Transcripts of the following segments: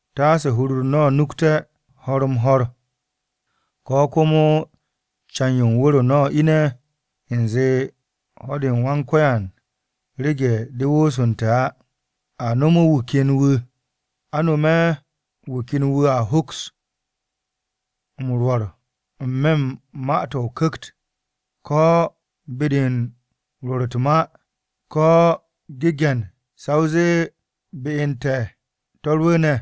Taase hur-u̱r no̱ nukte̱ ho̱r-m-ho̱r, ko̱ komo can-yo u̱n wu̱r-o no̱ ine̱ u̱nze ho̱-de u̱n Wan-Ko̱yan rege̱ de woosu̱nte̱ á. A nom wu̱ ken wu̱ a hoks m-rwo̱r n-me̱ u̱n ma-to̱ o-Ku̱kt, ko̱ be-de u̱n rwo̱r u̱t-ma, ko̱ genge̱n sa o zee be u̱n te̱ to̱ rwu̱u̱ne̱.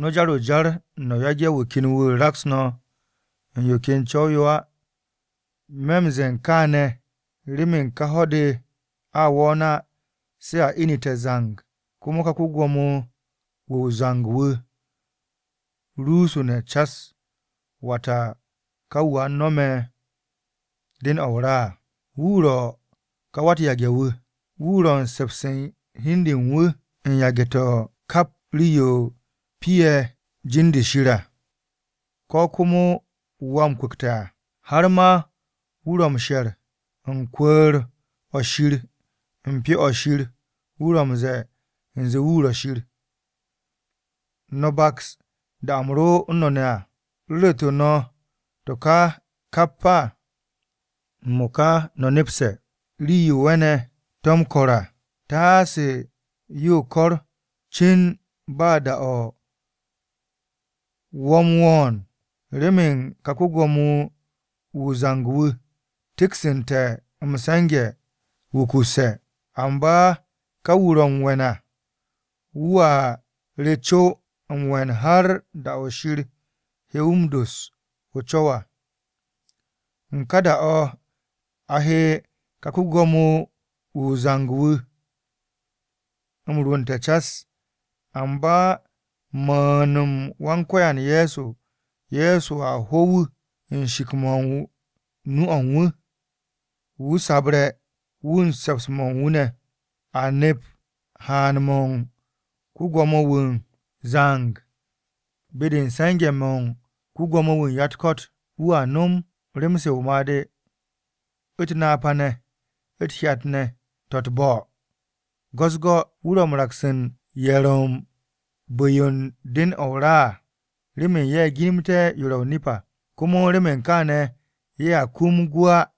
No̱ jar o-jar no̱ yage̱ wu̱ ken wu̱ raks no̱ u̱n yo ken co̱w-yo á. Me̱ u̱n ze̱e̱ kaane̱ remen ka ho̱-de a wo̱o̱n á se̱ a inite̱ zang komo ká ko-gwo̱mo-wu̱ o-zang wu̱ rusune̱ cas, wata ka wu̱ a nome̱ den-o̱ o-ra à. Wu̱ ro̱ ka wa-u̱t-yage̱-wu̱. Wu̱ ro̱ u̱n se̱ps u̱n hi u̱n de u̱n wu̱ u̱n yage̱-to̱ u̱n kap rii-yo piye̱ jin-de Shir à, ko̱ komo wu̱ a m-kwu̱kte̱ à. Har ma wu̱ ro̱ m-she'et u̱n kwu̱u̱r-o̱ Shir u̱n Pyo-o̱ Shir wu̱ ro̱ m-ze̱e̱ u̱nze wu̱ ro̱ Shir. ¿No̱ baks, da-o̱ u̱m ro u̱n no̱ ne̱ à, u̱m ru̱ru̱tu̱ no̱ to̱ kà kap á? M-mo̱ka no̱ nepse̱ rii-yo we̱ne̱ to̱ m-ko̱r à, taase yo kor cin ba da-o wo̱ u̱n wo̱o̱n. Remen ka ko-Gwo̱mo-wu̱ o-zang wu̱ te̱ksu̱nte̱ m-se̱nge̱ wukusse̱. Amba ka wu̱ ro̱ m-we̱n à wu̱a re co m-we̱n har da-o̱ Shir he wu̱ m-doss o-co̱w à. U̱n ka da-o̱ a he ka ko-Gwo̱mo-wu̱ o-zang wu̱ m-rwu̱nte̱ cas, amba u̱n mu̱u̱n-m Wan-Ko̱yan Ye̱so, Ye̱so a ho wu̱ u̱n shik-mo̱ u̱n nu-o̱ u̱n wu̱, wu̱ sabre̱ wu̱ u̱n se̱ps-mo̱ u̱n wu̱ ne̱. A nep haan-mo̱ u̱n ko-Gwo̱mo-wu̱ o-zang be-de u̱n se̱nge̱-mo̱ u̱n ko-Gwo̱mo-wu̱ u̱n ya-u̱t-ko̱t. Wu̱a nom rem-se o-made̱, u̱t-napa ne̱, u̱t-hyat ne̱ to̱ u̱t-bo̱ go̱-u̱s-go̱. Wu̱ ro̱ m-raks u̱n ye̱ ro̱ u̱n bu̱-yo u̱n den-o̱ o-ra à remen ye̱ ginimte̱ m-was u̱n yo ro̱ o-nip à, komo remen kaane̱ ye̱a kum gwu̱ á.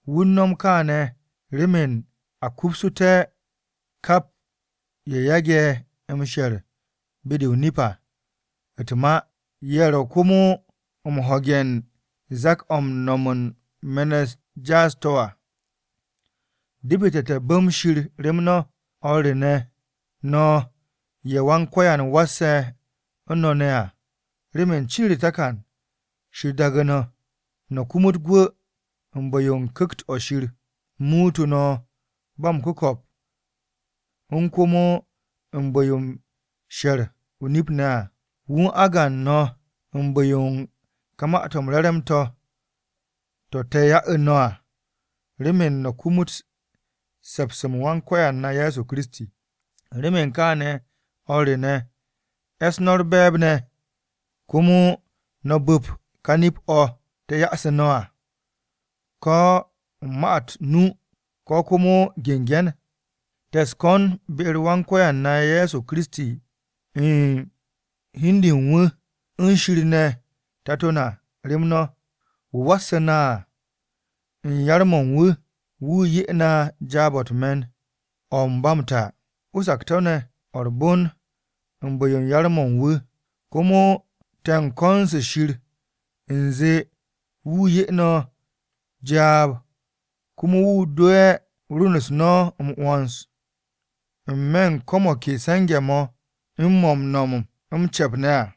Wu̱ u̱n no̱m kaane̱ remen a kupsu̱té̱ kap ye̱ yage̱ m-she̱r be-de o-nip à u̱t-ma, ye̱ ro̱ komo m-ho̱ge̱ u̱n zak-o̱ m-no̱m u̱n me̱n-u̱t jaas-to̱ à. Depete̱ te̱ bu̱m Shir rem no̱, o̱r re ne̱ no̱ ye̱ Wan-Ko̱yan wasse̱ u̱n no̱ ne̱ à, remen cin u̱r-takan Shir daagu̱ no̱, no̱ kumut gwu̱ u̱n bu̱-yo u̱n Ku̱kt-o̱ Shir muutu̱ no̱ ba m-ku̱ko̱p u̱n komo bu̱-yo u̱n she̱r o-nip ne̱ à. Wu̱ u̱n agan no̱ u̱n bu̱-yo u̱n ka Ma-to̱ m-Re̱re̱m to̱, to̱ te̱ ya'u̱ no̱ à, remen no̱ kumut se̱ps-m Wan-Ko̱yan na Ye̱so Kiristi. Remen kaane̱, o̱r re ne̱, e̱s no̱ u̱r-be̱e̱b ne̱, komo no̱ bu̱p ka nip-o̱ te̱ yoosu̱ no̱ à, ko̱ u̱n ma-to̱ nu, ko̱ komo genge̱n. Te̱ u̱s-ko̱n be-u̱r Wan-Ko̱yan na Ye̱so Kiristi u̱n hi u̱n de u̱n wu̱, u̱n Shir ne̱ Tato na rem no̱. Wu̱ wasu̱ na à, u̱n yar-mo̱ u̱n wu̱, wu̱ 'ye na jaab-o̱ u̱t-me̱n o̱ u̱n ba m-ta, o-sakto̱ ne̱ o̱ u̱r-bon u̱n bu̱-yo yar-mo̱ u̱n wu̱. Komo te̱ u̱n ko̱n-se Shir u̱nze wu̱ 'ye no̱ jaab komo wu̱ dowe̱ rwu̱n-u̱s no̱ m-'wo̱ns, n-me̱ u̱n ko̱ mo̱ ke se̱nge̱-mo̱, mo̱ m-nom m-ce̱p ne̱ à.